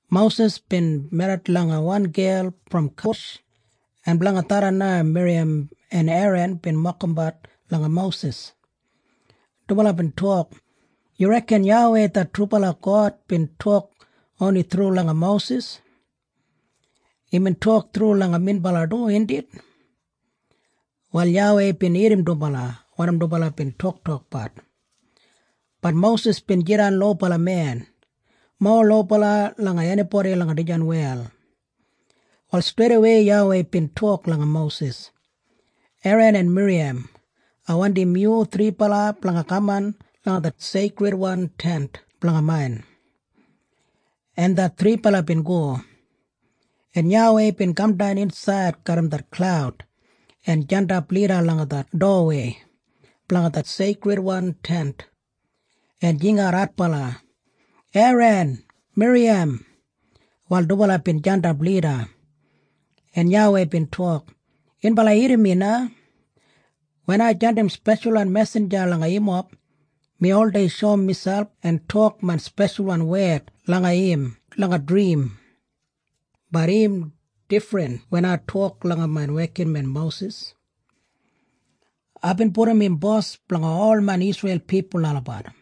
Mosis bin merrit langa wan gel brom Kush, en blanga tharran na Miriyam en Eran bin mokimbat langa Mosis. Dubala bin tok, “Yu reken YAWEI det trubala God bin tok oni thru langa Mosis? Imbin tok thru langa minbala du, indit?” Wal YAWEI bin irrim dubala wanim dubala bin toktokbat. Bat Mosis bin jidan lobala men, mowa lobala langa enibodi langa dijan wel. Wal streidawei YAWEI bin tok langa Mosis, Eran en Miriyam, “Ai wandim yu thribala blanga kaman langa det Seikridwan Tent blanga main.” En det thribala bin go. En YAWEI bin kamdan insaid garram det klaud en jandap lida langa det dowawei blanga det Seikridwan Tent, en jingat adbala, “Eran! Miriyam!” Wal dubala bin jandap lida, en YAWEI bin tok, “Yunbala irrim mi na. Wen ai jandim speshalwan mesinja langa yumob, mi oldei shoum miselp en tok main speshalwan wed langa im langa drim. Bat im difrin wen ai tok langa main wekinmen Mosis. Aibin pudum im bos blanga ol main Isreil pipul olabat.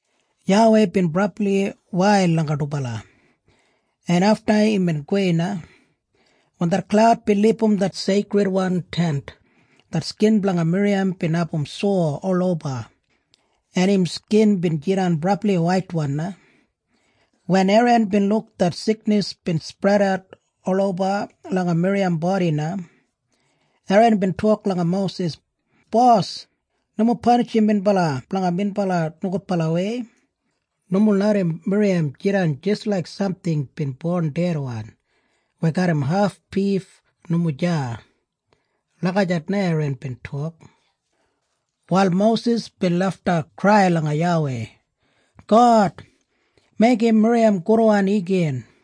YAWEI bin brabli wail langa dubala, en afta imbin gowei na. Wen det klaud bin libum det Seikridwan Tent, det skin blanga Miriyam bin abum sowa oloba, en im skin bin jidan brabli waitwan na. Wen Eran bin luk det siknis bin spredat oloba langa Miriyam bodi na, Eran bin tok langa Mosis, “Bos, nomo panishim minbala blanga minbala nogudbalawei. Nomo larram Miriyam jidan jis laik samting bin bon dedwan weya garram haf bif nomo deya.” Lagijat na Eran bin tok. Wal Mosis bin lafta krai langa YAWEI, “God, meigim Miriyam gudwan igin.”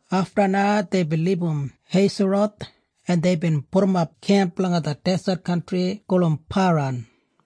Afta na deibin libum Heiseroth en deibin pudumap kemp langa det deset kantri gulum Paran.